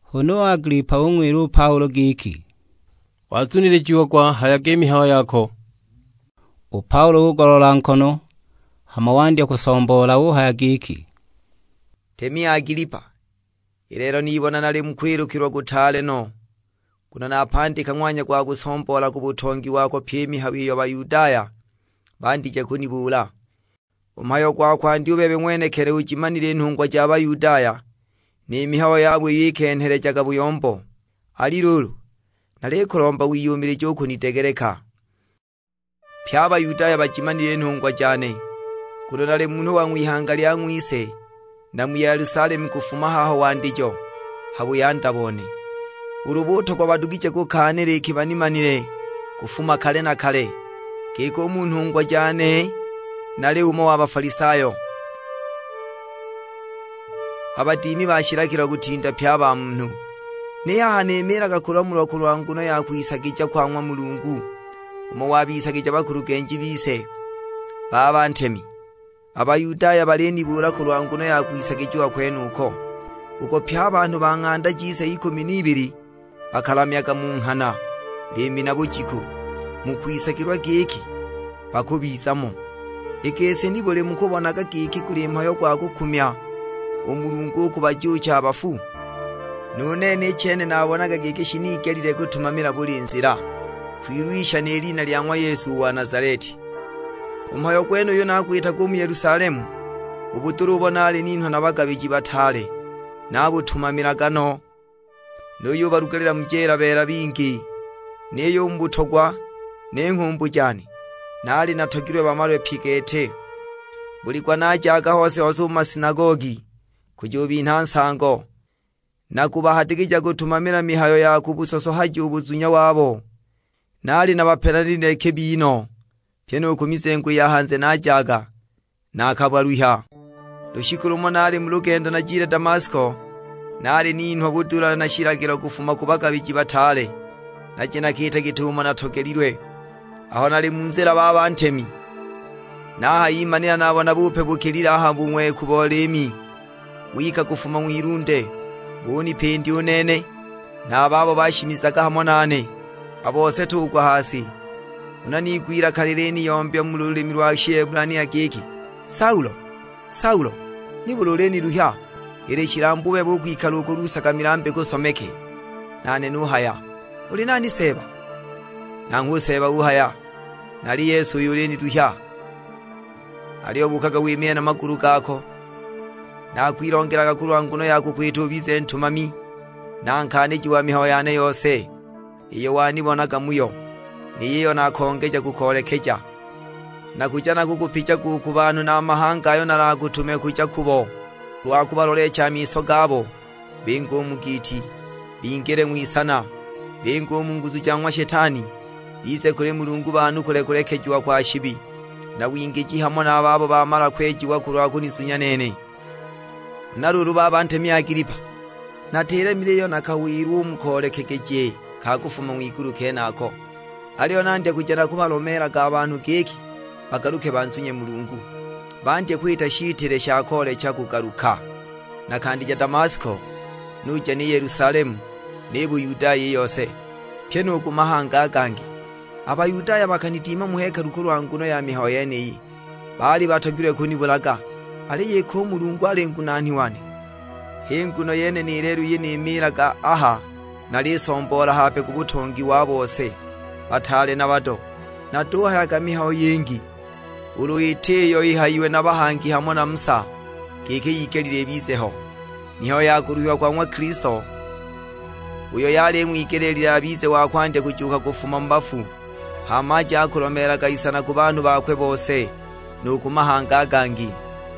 Huna u Agilipa ung'wila u Paulo giki, "Wazunilijiagwa hayaga i mihayo yako." U Paulo ugoloola nkono, hama wandya kusomboola; uhaya giki, "Ntemi Agilipa, i lelo nibona nali mu kwilukilwa kutaale no, nguno napandika ng'wanya gwa kusomboola ku butongi wako pyi i mihayo iyo Bayudaya bandije kunibuula. U mhayo gwa kwandya u bebe ng'wenekili ujimanile i nhungwa ja Bayudaya ni mihayo yabo iyo ikenhelejaga buyombo; ali luulu, nalikulomba wiyumilije u kunidegeleka. Pye a Bayudaya bajimanile i nhungwa jane, nguno nali munhu wa ng'wihanga lya ng'wise na mu Yelusalemu kufuma haho wandijo, ha buyanda bone. Ulu butogwa badugije kukaanila, iki banimanile kufuma kale na kale, giki u mu nhungwa jane nali umo wa Bafalisayo, a badimi ba shilagilo kutinda pye a banhu. Ni haha nimiilaga kulamulwa kulwa nguno ya kwisagija kwa ng'wa Mulungu, umo wabisagigija bakulugenji bise. Baba ntemi, a Bayudaya balinibuula kulwa nguno ya kwisagijiwa kwenuko, uko pye a banhu ba ng'anda jise ikumi n'ibili bakalamyaga mu nghana, liimi na bujiku, mu kwisagilwa giki bakubiza mo. I gisi nibuli mukubonaga giki guli mhayo gwa kukumya u Mulungu u kubajuucha a bafu? Nu nene i chene naabonaga giki shinigelile kutumamila buli nzila, kwilwisha ni lina lya ng'wa Yesu u wa Nazaleti. U mhayo gwenuyu nagwitaga u mu Yelusalemu; u budula ubo naali ninhwa na bagabiji bataale nabutumamilaga no, nuyubalugalila mu jeela beela bingi. Niyo u mu butogwa ni nghumbu jane, naali natogilwe bamalwe pye gete! Buli gwa najaga hose-hose u mu masinagogi, kujubinha nsango, na kubahadikija kutumamila mihayo ya kubusosohaja u buzunya wabo. Naali nabapelanilile kibi no, pyi nu ku mizengo i ya hanze najaga naakabaluhya. "Lushiku lumo nali mu lugendo najile Damasko, naali ninhwa budula na shilagilo kufuma ku bagabiji bataale, naje nakiite git'umo natogelilwe. Aho nali mu nzila baba ntemi, nahayimanila nabona bupe bukilile a ha bung'weku bo liimi; wika kufuma ng'wilunde, bunipindya u nene, na a babo bashimizaga hamo nane. A bose tugwa ha si, huna niigwa ilaka liliniyombya mu lulimi lwa Shihebulania giki, 'Saulo, Saulo, nibuli uliniluhya? Ili shilambu u bebe u kwikala ukulusaga milambi ku someke!' Nane nuhaya, 'Uli nani Seeba?' Nanghwe u Seeba uhaya, 'Nali Yesu uyo uliniluhya. Aliyo buukaga wimiile na magulu gako; naakwilongelaga kulwa nguno ya kukwita ubize ntumami, na nkaaniji wa mihayo yane yose, iyo wanibonaga muyo, ni yiyo nakongeja kukoolekeja. Nakuja nakukupijaga u ku banhu na a mahanga ayo nalakutume kuja kubo, kulwa kubaloleecha a miso gabo; binge u mu giiti, bingile ng'wisana, binge u mu nguzu ja ng'wa Shetani, bize kuli Mulungu banukule kulekejiwa kwa shibi, na wingiji hamo na a babo bamala kwejiwa kulwa kunizunya nene.' "Huna luulu baba ntemi Agilipa, natilemile iyo nakawilwa u mu koolekegeje ka kufuma ng'wigulu kenako. Aliyo nandya kuja nakubalomeelaga a banhu giki bagaluke banzunye Mulungu, bandye kwita shitile sha koolecha kugaluka. Nakandija Damasko, nuja ni Yelusalemu, ni Buyudaya i yose; pyi nu ku mahanga a gangi. A Bayudaya bakanidimila mu hekalu kulwa nguno ya mihayo yeniyi, baali batogilwe kunibulaga. Aliyo iki u Mulungu ali ngunaani wane, h'i nguno yene ni lelo iyi nimiilaga aha nalisomboola hape ku butongi wa bose, bataale na bado. Natuhayaga mihayo yingi, ulu iti iyo ihayiwe na bahangi hamo na Musa, giki yigelile ibize ho; mihayo ya kuluhiwa kwa ng'wa Kilisto, uyo yali ing'wigelile abize wa kwandya kujuuka kufuma mu bafu, hama aje akulomeelaga isana ku banhu bakwe bose, nu ku mahanga a gangi."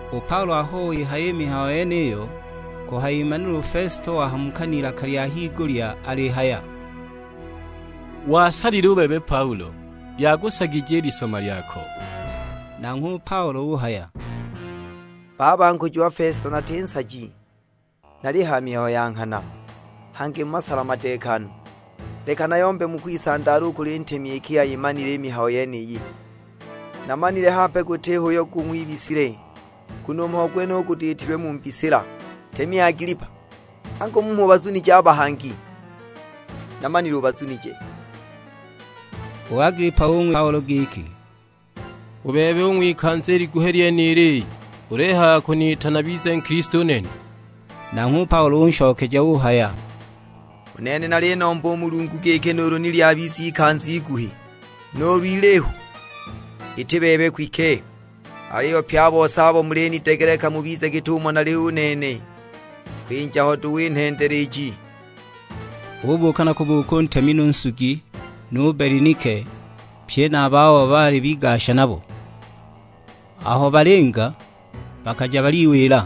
U Paulo aho wihaya i mihayo yeniyo, kuhayimanila u Fesito wahamuka n'ilaka lya higulya alihaya, "Wasalile u bebe Paulo; lyakusagije i lisoma lyako!" Nanghwe u Paulo uhaya, "Baba nkujiwa Fesito nati nsaji, nalihaya mihayo ya nghana, hangi mu masala madeekanu. Leka nayombe mu kwisandaala u kuli ntemi iki ayimanile i mihayo yeniyi. Namanile hape gutiho uyo gung'wibisile, nguno u mhayo gwenuyu gutiitilwe mu mbisila. Ntemi Agilipa, angu mmho ubazunije a bahangi? Namanile ubazunije!" U Agilipa ung'wila u Paulo giki, "U bebe, u ng'wikanza i liguhi lyenili ulihaya ukuniita nabize Nkilisto u nene?" Nanghwe u Paulo unshokeja uhaya, "U nene nalinomba u Mulungu giki nuulu ni lyabiza ikanza iguhi, nuulu ilihu, iti bebe kwike; aliyo pye a bose abo mulinidegeleka mubize git'umo nali u nene, kwinja ho duhu i nhendele iji!" Ubuuka na kubuuka u ntemi nu nsugi, nu Belinike; pye na a babo baali bigasha nabo. Aho balinga, bakaja baliwila,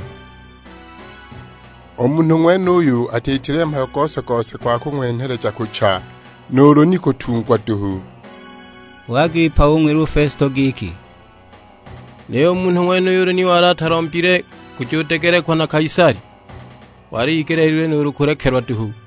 "U munhu ng'wenuyu atiitile mhayo gose-gose gwa kung'wenheleja kucha, nuulu ni kutungwa duhu!" U Agilipa ung'wila u Fesito giki, "Niyo u munhu ng'wenuyu ulu ni wali atalombile kujudegelekwa na Kaisali, wali igeleelilwe nuulu kulekelwa duhu."